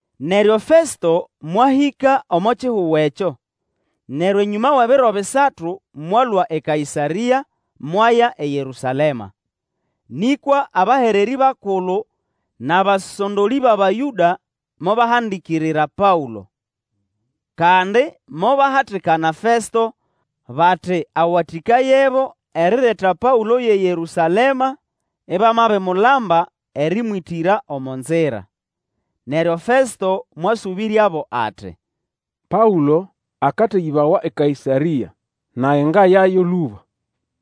Neryo Festo mwahĩka omo kihugo ekyo, neryo enyũma wʼebiro bisatu mwalũa eKaĩsarĩa mwaya eYerũsalema. Nĩkwa abahererĩ bakulu nʼabasondolĩ bʼAbayũda mobahandikirira Paũlo. Kandi mobahatikana Festo, bati awatĩkayebo erireta Paũlo yʼeYerũsalema, ibamabimulamba erĩmwĩtĩra omo nzira. Neryo Festo mwasũbĩryabo ati, Paũlo akateyĩbawa eKaĩsarĩa, nage ngayayo lũba.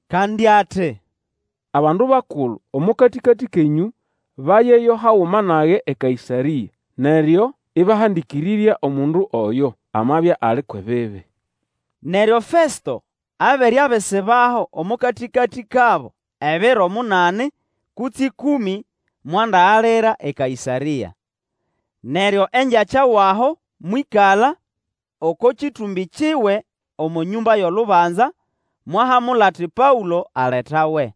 Kandi ati, Abandu bakulu omo katĩkatĩ kenyũ bayeyo haguma nage eKaĩsarĩa, neryo ibahandikirira omundu oyo, amabya ali kwʼebibi. Neryo Festo abere abisibaho omo katĩkatĩ kabo ebiro munani kutse ĩkũmĩ, mwandagalira eKaĩsarĩa. Neryo engyakya wʼaho mwĩkala oko kĩtũmbĩ kiwe omo nyũmba yʼolubanza, mwahamula ati Paũlo aletawe.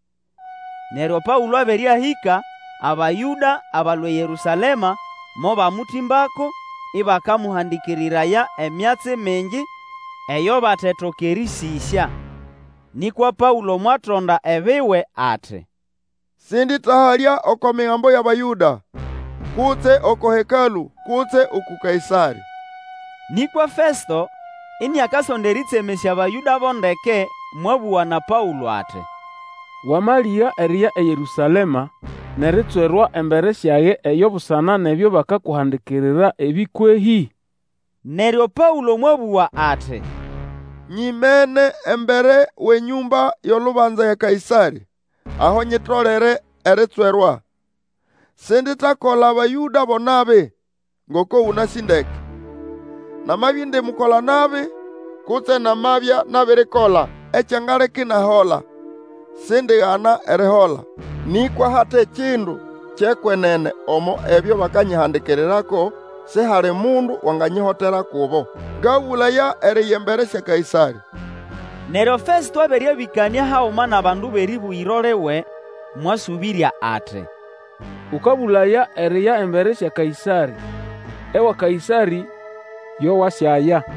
Neryo Paũlo abere ahĩka, Abayũda abalũa eYerũsalema mobamũtĩmbako, ĩbakamũhandĩkĩrĩraya emyatsi mingi eyo batetoka erĩsĩsya. Nĩkwa Paũlo mwatonda ebiwe ati, Sĩndĩtahalya oko Migambo yʼAbayũda, kutse oko Hekalũ, kutse uku Kaĩsarĩ. Nĩkwa Festo, iniakasonda erĩtsemesya Bayũda bo ndeke, mwabũga na Paũlo ati, Wamalĩga eriya eYerũsalema nʼeritswerwa embere syage eyo busana nʼebyo bakakuhandikirira ebĩ kwehĩ? Neryo Paũlo mwabũga ati, Nyimene embere wʼenyũmba yʼolubanza ya Kaĩsarĩ, aho nyitolere eritswerwa. Sinditakola Abayũda bo nabi, ngoko ũnasĩ ndeke. Namabya indi mukola-nabi, kutse namabya nabirikola ekyangaleka inahola, sindigana erihola. Nĩkwa hate kindu kyʼekwenene omo ebyo bakanyihandikirirako, sihali mundu wanganyihotera kubo. Ngabũlaya eriya embere sya Kaĩsarĩ. Neryo Festo abere abĩkanĩa haguma nʼabandu bʼerĩbũgĩro liwe, mwasũbĩrya ati, Ũkabũlaya eriya embere sya Kaĩsarĩ, ewa Kaĩsarĩ yo wanasyaya.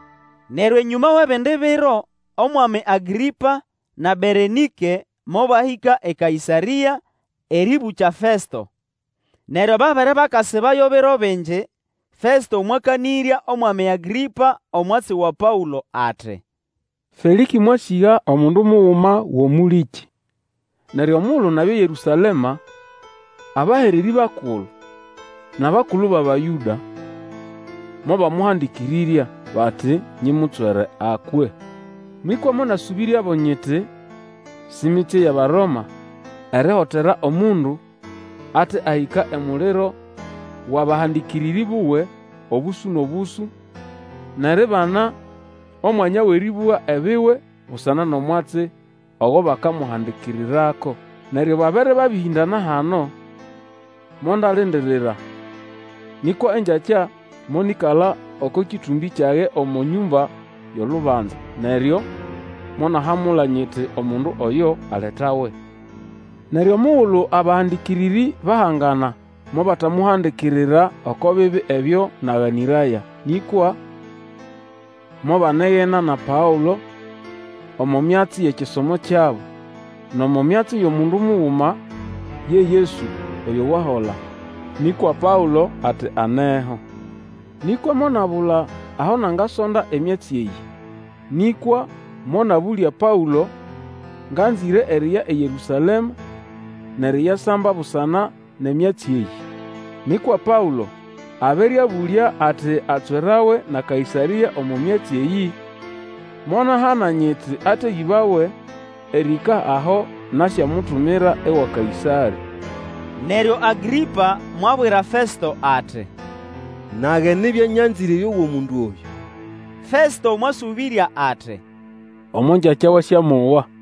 Neryo enyũma wʼebindi biro, Omwami Agrĩpa na Berenĩke mobahĩka eKaĩsarĩa erĩbũkya Festo. Neryo babere bakasibayo biro bingi, Festo mwakanĩrya Omwami Agrĩpa omwatsi wa Paũlo ati, Felĩkĩ mwasĩga omundu muguma wʼomũlĩkĩ. Neryo omugulu nabya eYerũsalema, abahererĩ bakulu nʼabakulu bʼAbayũda mobamũhandĩkĩrĩrya, bati nyimutswere akwe. Nĩkwa monasũbĩryabo nyiti si mitsye yʼAbaroma erihotera omundu ate ahĩka emuliro wʼabahandĩkĩrĩrĩ buwe obũsũ nʼobũsũ, nʼeribana omwanya wʼerĩbũga ebiwe busana nʼomwatsi ogo bakamuhandikirirako. Neryo babere bahĩndana hano, mondalindirira, nĩkwa engyakya monĩkala oko kĩtũmbĩ kyage omo nyũmba yʼolubanza, neryo monahamula, nyiti omundu oyo aletawe. Neryo omugulu abahandĩkĩrĩrĩ bahangana, mobatamuhandikirira oko bibi ebyo naganĩraya. Nĩkwa mobanegena na Paũlo omo myatsi yʼekisomo kyabo, nʼomo myatsi yʼomundu muguma, ye Yesu oyo wahola. Nĩkwa Paũlo ati aneho. Nĩkwa monabula aho nagasonda emyatsi eyĩ, nĩkwa monabũlya Paũlo ngʼanzĩre eriya eYerũsalema nʼeriyasamba busana nʼemyatsi eyĩ. Nĩkwa Paũlo abere abũlya ati atswerawe na Kaĩsarĩ omo myatsi eyĩ, monahana nyiti ateyĩbawe erĩhĩka aho nasyamutumira ewa Kaĩsarĩ. Neryo Agrĩpa mwabwira Festo ati, Nage nibya nyanzĩre erĩowa omundu oyũ. Festo mwasũbĩrya ati, Omo ngyakya wasyamowa.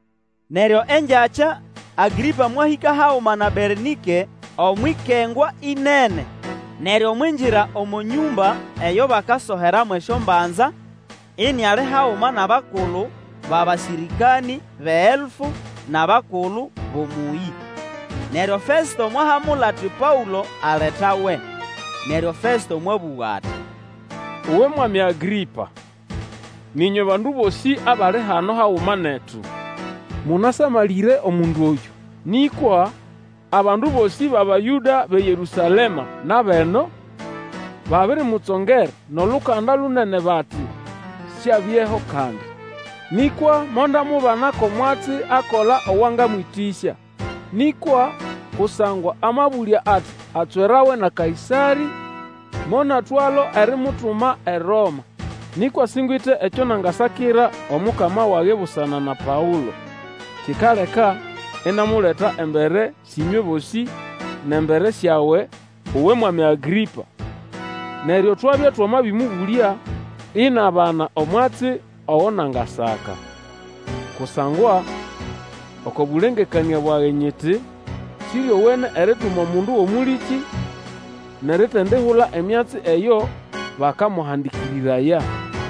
Neryo engyakya, Agrĩpa mwahĩka haguma na Berenĩke, omwʼikengwa ĩnene, neryo mwingira omo nyũmba eyo bakasoheramo esyombanza, iniali haguma nʼabakulu bʼabasĩrĩkanĩ bʼeelfu, nʼabakulu bʼomũyĩ. Neryo Festo mwahamula ati Paũlo aletawe. Neryo Festo mwabũga ati, Uwe mwami Agrĩpa, nʼĩnywe bandu bosĩ abali hano haguma netu, mũnasamalĩre omundu oyũ, nĩkwa abandu bosĩ bʼAbayũda bʼeYerũsalema nʼabʼeno, babirimutsongera nʼolukanda lunene bati siabyeho kandi. Nĩkwa mondamubana ko mwatsi akola owangamwĩtĩsya; nĩkwa kusangwa amabũlya ati atswerawe na Kaĩsarĩ, monatwalo erimutuma eRoma. Nĩkwa singwite ekyo nangasakira omukama wage busana na Paũlo. Kikaleka inamuleta embere syʼĩnywe bosĩ, nʼembere syawe, uwe mwami Agrĩpa, neryo twabya twamabĩmũbũlya, inabana omwatsi ogo nangasaka. Kusangwa oko bũlengekanĩa bwage nyiti Sĩryowene erituma omundu wʼomũlĩkĩ, nʼeritindahula emyatsi eyo bakamũhandĩkĩrĩraya.